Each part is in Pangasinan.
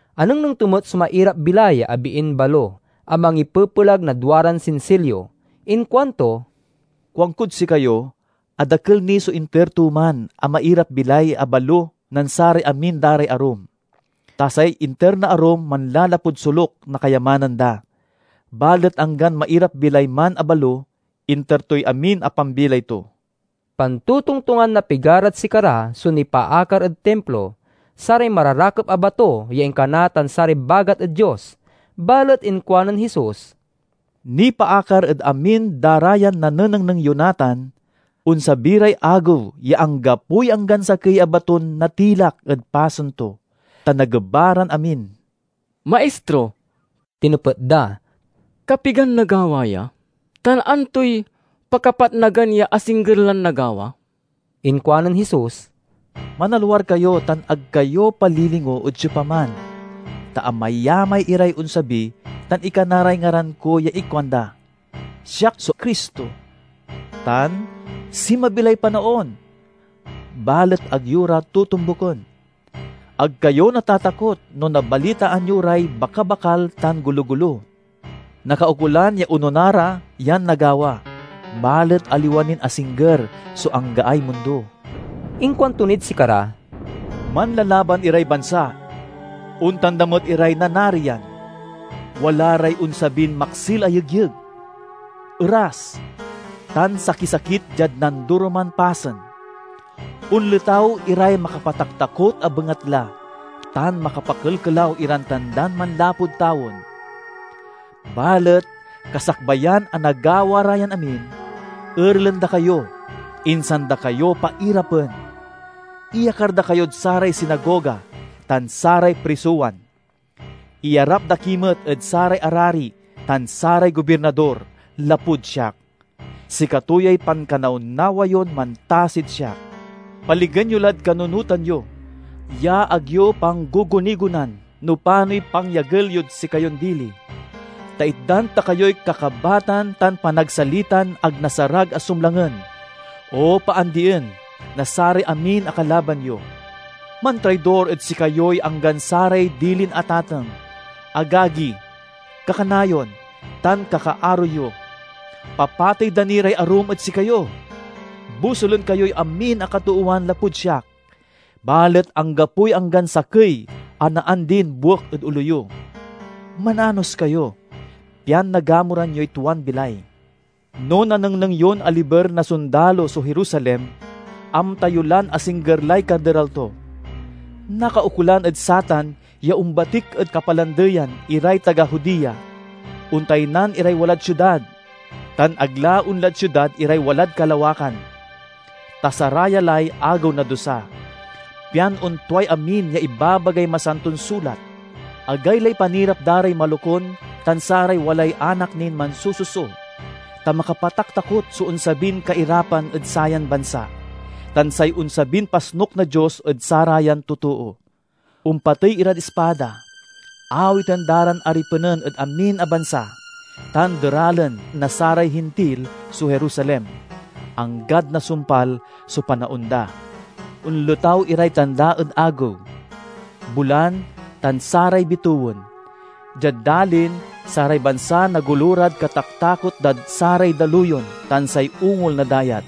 Anengneng to met so mairap-bilay a biin balo a mangipepelag na duaran sinsilyo. Inkuanto, "Kuankod sikayo a dakel ni so inter to man a mairap-bilay a balo nen saray amin da ray arum. Ta say inter na arum manlalapud soluk na kayamanan da, balet anggan mairap-bilay man a balo, inter toy amin a pambilay to." Pantotongtongan na pigarad sikara so nipaakar ed Timplo, saray mararakep a bato ya inkana tan saray bagat ed Dios. Balet inkuanen Jesus, "Nipaakar ed amin da ra yan nanenengneng yo natan: onsabi ray agew ya anggapoy anggan sakey a baton natilak ed pasen to, ta nageba ran amin." "Maistro," tinepet da, "kapigan nagawa ya? Tan antoy pakapatnagan ya asingger lan nagawa?" Inkuanen Jesus, "Manalwar kayo tan ag kayo palilingo ed siopaman! Ta amayamay iray onsabi tan ikana ray ngaran ko ya ikuanda, 'Siak so Cristo!' tan 'Sinmabi lay panaon!' Balet ag yo ra totombuken. Ag kayo natatakot no nabalitaan yo ray bakabakal tan gologolo. Nakaukolan ya onona ra yan nagawa, balet aliwa nin asingger so anggaay mundo." Inkuanto nid sikara, "Manlalaban iray bansa; ontan da met iray nanarian. Wala ray onsabin maksil a yegyeg, eras, tan sakisakit diad nandoroman pasen. Onletaw iray makapataktakot a bengatla tan makapakelkelaw iran tandan manlapud tawen. Balet kasakbayan a nagawa ra yan amin, erelen da kayo, insan da kayo pairapen. Iyakar da kayod saray sinagoga tan saray prisowan. Iyarap da ki met ed saray arari tan saray gobirnador, lapud siak. Sikato yay pankanawnawa yon mantasid siak. Paligen yo, lad kanunotan yo ya ag yo panggugunigonan no panoy pangyagel yod sikayon dili, ta itdan ta kayoy kakabatan tan panagsalitan ag nasarag a sumlangen o paandien na saray amin a kalaban yo. Mantraidor ed sikayoy anggan saray dilin atateng, agagi, kakanayon, tan kakaaro yo. Papatey da ni ray arum ed sikayo. Bosulen kayoy amin a katoowan lapud siak, balet anggapoy anggan sakey a naandin buek ed olo yo. Mananos kayo, pian nagamuran yoy tuan bilay." "No nanengneng yon aliber na sondalo so Jerusalem, amta yo lan asingger lay kaderal to. Nakaukolan ed satan ya ombatik ed kapalandeyan iray taga Judea, ontaynan iray walad siudad, tan ag la onlad siudad iray walad kalawakan. Ta saraya lay 'Agew na Dusa,' pian ontuay amin ya ibabagay Masanton Sulat. Agaylay panirap da ray malokun tan saray walay anak nin mansususo! Ta makapataktakot so onsabin kairapan ed sayan bansa, tan say onsabin pasnuk na Dios ed sarayan totoo. Ompatey irad ispada, awiten da ran aripenen ed amin a bansa, tan deralen na saray Hintil so Jerusalem, anggad nasumpal so panaon da." "Onletaw iray tanda ed agew, bulan, tan saray bitewen. Diad dalin, saray bansa nagolo rad kataktakot dad saray daluyon tan say ungol na dayat.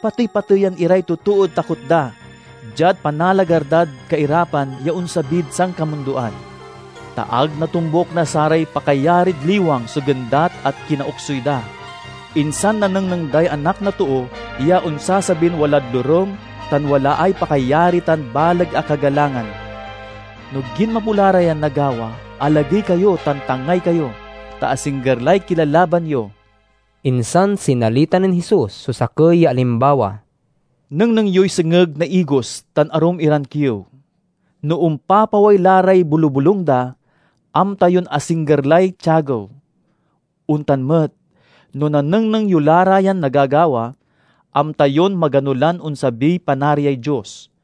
Patey-pateyan iray totood takot da diad panalagar dad kairapan ya onsabid sankamundoan, ta ag natombuk na saray pakayarid liwang so gendat a kinaoksuy da. Insan nanengneng day Anak na Too ya onsasabin walad lorem tan walaay pakayari tan baleg a kagalangan. No ginmapo la ra yan nagawa, alagey kayo tan tangay kayo, ta asingger lay kilalaban yo." Insan sinalita nen Jesus so sakey ya alimbawa, "Nengneng yoy sengeg na igos tan arum iran kiew. No ompapaway la ray bolubolung da, amta yon asingger lay tiagew. Ontan met, no nanengneng yo la ra yan nagagawa, amta yon magano lan onsabiy Panariay Dios.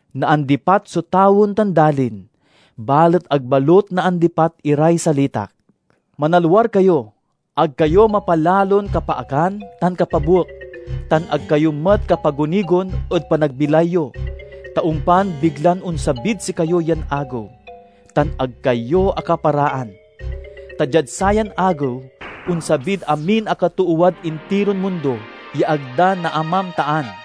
Naandipat so tawen tan dalin, balet ag balut naandipat iray salitak." "Manalwar kayo! Ag kayo mapalalon kapaakan tan kapabuek, tan ag kayo met kapagunigon ed panagbilay yo, ta ompan biglan onsabid sikayo yan Agew tan ag kayo akaparaan. Ta diad sayan Agew onsabid amin a katoowad intiron mundo ya ag da naamamtaan.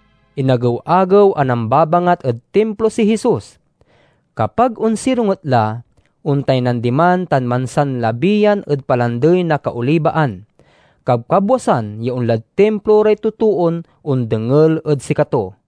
Inagew-agew a nambabangat ed Timplo si Jesus. Kapag onsironget la, ontaynan diman tan mansanlabiyan ed Palandey na Kaolibaan. Kabkabwasan ya onlad Timplo ray totoon ondengel ed sikato.